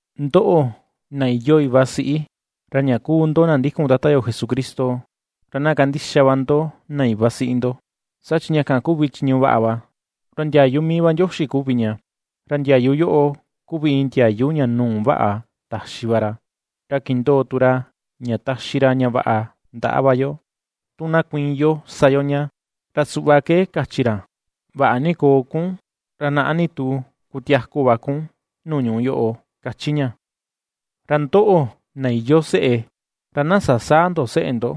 Ndoꞌo, na iyoo iva siꞌi, ra ña kuu ndo na ndikun Tata yo Jesucristo, ra na kandixa va ndo na iva siꞌi ndo, saa chi ña kan kuvi chiñu vaꞌa va. Ra ndiayu mii va Ndioxi kuvi ña. Ra ndiayu yoꞌo kuvi iin ndiayu ña nuu vaꞌa taxi va ra, ra kindoo tu ra ña taxi ra ña vaꞌa ndaꞌa va yo. Tu na kuiin yo sa yo ña, ra suꞌva ke kachi ra: “Vaꞌa ni koo kun, ra naꞌa ni tu kutiaku va kun nuu ñuꞌu yoꞌo”, kachi ña. Ra ndoꞌo, na iyoo seꞌe, ra na sasäa ndo seꞌe ndo,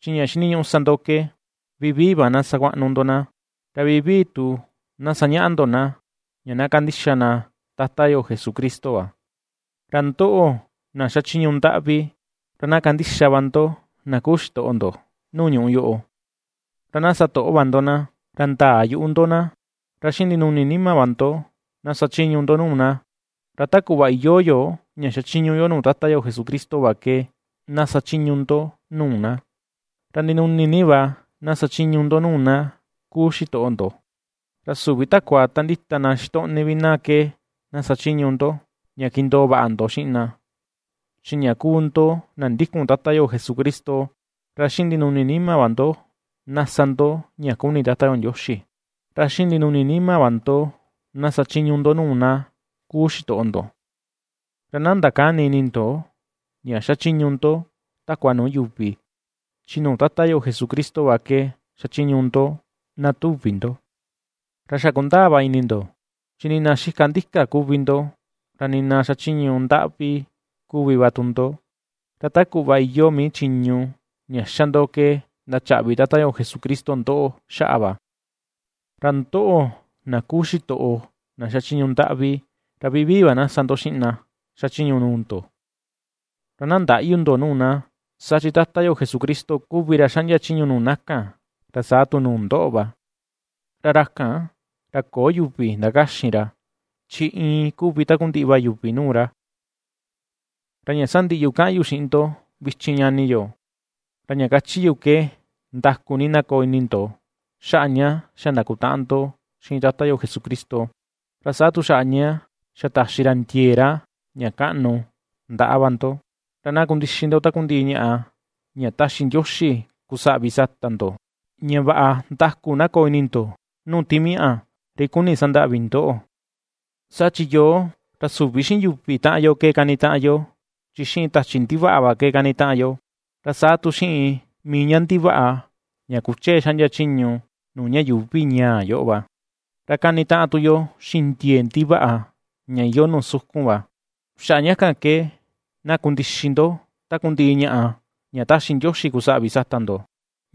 chi ña xiniñuꞌu sa ndo ke vivii va na sakuaꞌnu ndo na, ra vivii tu na sañaꞌa ndo na, ña na kandixa na Tata yo Jesucristo va. Ra ndoꞌo, na xachiñu ndaꞌvi, ra na kandixa va ndo na kuu xitoꞌo ndo nuu ñuꞌu yoꞌo, ra na sa toꞌo va ndo na, ra ndäa yuꞌu ndo na, ra xiꞌin ndinuni nima va ndo, na sachiñu ndo nuu na, ra ta kuꞌva iyoo yo ña xachiñu yo nuu Tata yo Jesucristo va ke na sachiñu ndo nuu na. Ra ndinuni ni va na sachiñu ndo nuu na kuu xitoꞌo ndo, ra süvi takua ta ndita na xitoꞌni vi na ke na sachiñu ndo, ña kindoo vaꞌa ndo xiꞌin na, chi ña kuu ndo na ndikun Tata yo Jesucristo. Ra xiꞌin ndinuni nima va ndo, na sa ndo ña kuni Tata yo Ndioxi. Ra xiꞌin ndinuni nima va ndo na sachiñu ndo nuu na kuu xitoꞌo ndo, ra na ndakäni ini ndo ña xachiñu ndo takua nuu yuvi, chi nuu Tata yo Jesucristo va ke xachiñu ndo, na tuvi ndo. Ra xa kundaa va ini ndo, chi nii na xika ndika kuvi ndo, ra nii na xachiñu ndaꞌvi kuvi va tu ndo, ra ta kuꞌva iyoo mii chiñu ña xa ndo ke ndachaꞌvi Tata Jesucristo ndoꞌo xaꞌa va. Ra ndoꞌo, na kuu xitoꞌo na xachiñu ndaꞌvi, ra vivii va na sa ndo xiꞌin na xachiñu nuu ndo, ra na ndäꞌyu ndo nuu na. Saa chi Tata yo Jesucristo kuvi ra xaꞌndia chiñu nuu na kan, ra saa tu nuu ndoꞌo va, ra ra kan, ra köo yuvi ndakaxin ra, chi iin kuvi takundiꞌi va yuvi nuu ra. Ra ña sandiꞌi yu kaꞌan yu xiꞌin ndo vichin ñani yo, ra ña kachi yu ke ndaku ni na koo ini ndo xaꞌa ña xa ndakutaꞌan ndo xiꞌin Tata yo Jesucristo, ra saa tu xaꞌa ña xa taxi ra ndiee ra ña kaꞌnu ndaꞌa va ndo. Ra na kundixi ndo takundiꞌi ñaꞌa ña taxi Ndioxi kusaꞌvi sata ndo, ña vaꞌa ndaku na koo ini ndo, nuu timiaꞌa ri kuni sandaꞌvi ndoꞌo. Saa chi yoo, ra süvi xiꞌin yuvi taꞌan yo ke kanitaꞌan yo, chi xiꞌin tachi ndivaꞌa va ke kanitaꞌan yo, ra saa tu xiꞌin mii ña ndivaꞌa ña kuchee xaꞌndia chiñu nuu ña yuuvi ñaa yoꞌo va, ra kanitaꞌan tu yo xiꞌin ndiee ndivaꞌa ña iyoo nuu sukun va. Xaꞌa ña kan ke, na kundixi ndo takundiꞌi ñaꞌa ña ^taxi Ndioxi kusaꞌvi sata ndo,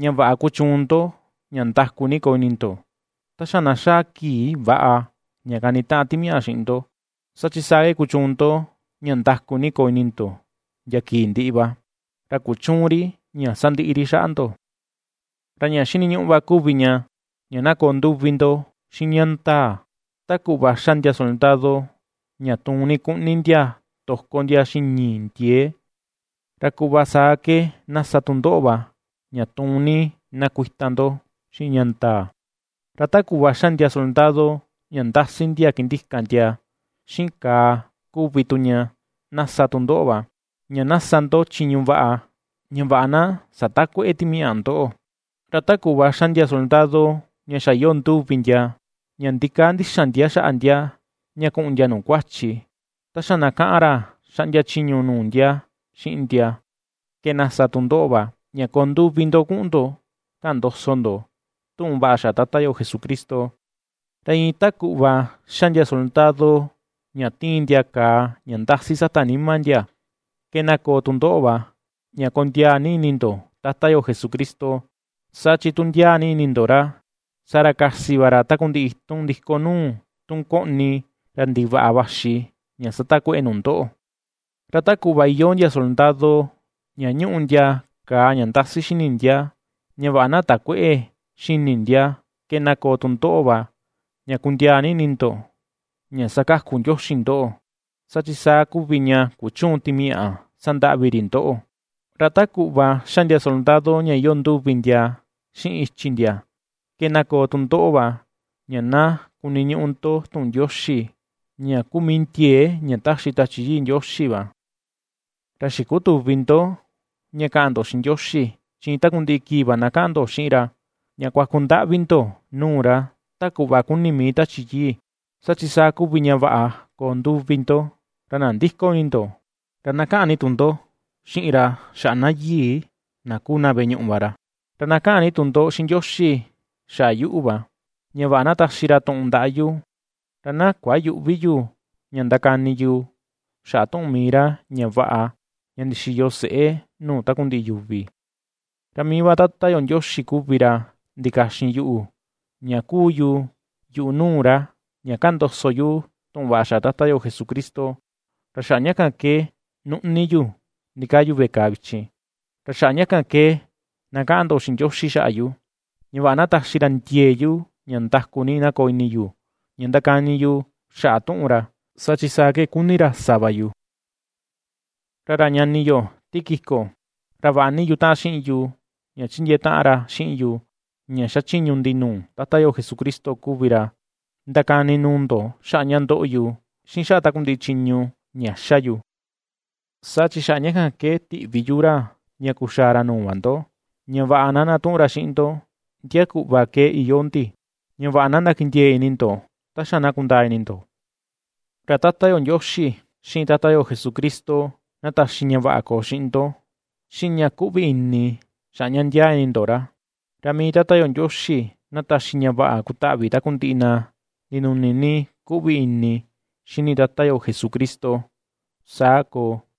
ña vaꞌa kuchuun ndo ña ndaku ni koo ini ndo, ta xa na xaa kii väꞌa ña kanitaꞌan timiaꞌa xiꞌin ndo, saa chi saa ke kuchuun ndo ña ndaku ni koo ini ndo ndia kii ndiꞌi va, ra kuchüun ri ña sandiꞌi ri xaꞌa ndo. Ra ña xiniñuꞌu va kuvi ña, ña na koo nduvi ndo xiꞌin ña ndaa. Ta kuꞌva ^xa ndia soldado ña tuun ni kuꞌni ndia toko ndia xiꞌin ñii ndiee, ra kuꞌva saa ke na sa tu ndoꞌo va, ña tuun ni na kuita ndo xiꞌin ña ndaa. Ra ta kuꞌva ^xa ndia soldado ña ndasi ndia kindika ndia xiꞌin kàà kuvi tu ña, na sa tu ndoꞌo va, ña na sa ndo chiñu vaꞌa, ña vaꞌa na satakuëꞌe timaꞌa ndoꞌo. Ra ta kuꞌva ^xa ndia soldado ña xa iyoo nduvi ndia ña ndikaa ndixan ndia xaꞌa ndia ña kuꞌun ndia nuu kuachi, ta xa na kaꞌan ra xaꞌndia chiñu nuu ndia xiꞌin ndia, ke na sa tu ndoꞌo va, ña koo nduvi ndo kuꞌun ndo kaꞌan ndoso ndo tuꞌun vaꞌa xaꞌa Tata yo Jesucristo. Ra iin ta kuꞌva ^xa ndia soldado ña tiin ndia kàà ña ndasi sata nima ndia, ke na koo tu ndoꞌo va, ña kondiaa ni ini ndo Tata yo Jesucristo, saa chi tu ndiaa ni ini ndo ra, saa ra kasi va ra takundiꞌi itun ndiko nuu, tun koꞌni ra ndivaꞌa vaxi ña satakueꞌe nu ndoꞌo. Ra ta kuꞌva iyoo ndia soldado, ña ñuꞌu ndia kàà ña ndasi xini ndia ña vaꞌa na takuëꞌe xini ndia, ke na koo tu ndoꞌo va, ña kundiaa ini ndo ña ^sakaku Ndioxi ndoꞌo, saa chi saa kuvi ña kuchüun timiaꞌa sandaꞌvi ri ndoꞌo. Ra ta kuꞌva ^xa ndia soldado ña iyoo nduvi ndia xiꞌin ichi ndia, ke na koo tu ndoꞌo va, ña na kuniñuꞌu ndo tuꞌun Ndioxi, ña kuu mii ndiee ña taxi Tachi Yii Ndioxi va. Ra xikutüvi ndo ña kaꞌan ndo xiꞌin Ndioxi, chi iin takundiꞌi kii va na kaꞌan ndo xiꞌin ra, ña kuaku ndaꞌvi ndo nuu ra, ta kuꞌva kuni mii Tachi Yii. Saa chi saa kuvi ña vaꞌa koo nduvi ndo, ra nandïko ini ndo, ra na kaꞌan ni tu ndo xiꞌin ra xaꞌa na yii, na kuu na veꞌe ñuꞌu va ra. Ra na kaꞌan ni tu ndo xiꞌin Ndioxi xaꞌa yuꞌu va, ña vaꞌa na taxi ra tuꞌun ndaꞌa yu, ra na kuayüꞌvi yu ña ndakani yu xaꞌa tuꞌun mii ra ña vaꞌa ña ndixiyo seꞌé nuu takundiꞌi yuvi. Ra mii va Tata yo Ndioxi kuvi ra ndikaxin yuꞌu, ña ^kuu yu yuꞌu nuu ra, ña kaꞌan ndoso yu tuꞌun vaꞌa xaꞌa Tata yo Jesucristo, ra xaꞌa ña kan ke nuꞌni yu ndikaa yu veꞌe kàà vichin. Ra xaꞌa ña kan ke na kaꞌan ndo xiꞌin Ndioxi xaꞌa yu, ña vaꞌa na taxi ra ndiee yu ña ndaku ni na koo ini yu ña ndakani yu xaꞌa tuꞌun ra, saa chi saa ke kuni ra sa va yu. Ra ra ñani yo Tíquico, ra vaꞌa ni yutaꞌan xiꞌin yu ña chindiee taꞌan ra xiꞌin yu ña xachiñu ndi nuu Tata yo Jesucristo kuvi ra, ndakani nuu ndo xaꞌa ña ndoꞌo yu, xiꞌin xaꞌa takundiꞌi chiñu ña ^xa yu. Saa chi xaꞌa ña kan ke tiꞌvi yu ra ña kuxaa ra nuu va ndo, ña vaꞌa na ndatuꞌun ra xiꞌin ndo, ndia kuꞌva ke iyoo ndi, ña vaꞌa na ndakindiee ini ndo, ta xa na kundaa ini ndo. Ra Tata yo Ndioxi, xiꞌin Tata yo Jesucristo, na taxi ña vaꞌa koo xiꞌin ndo, xiꞌin ña kuꞌvi ini, xaꞌa ña ndiaa ini ndo ra. Ra mii Tata yo Ndioxi na taxi ña vaꞌa kutaꞌvi takundiꞌi na ndinuni ni kuꞌvi ini xini Tata yo Jesucristo. Saa koo.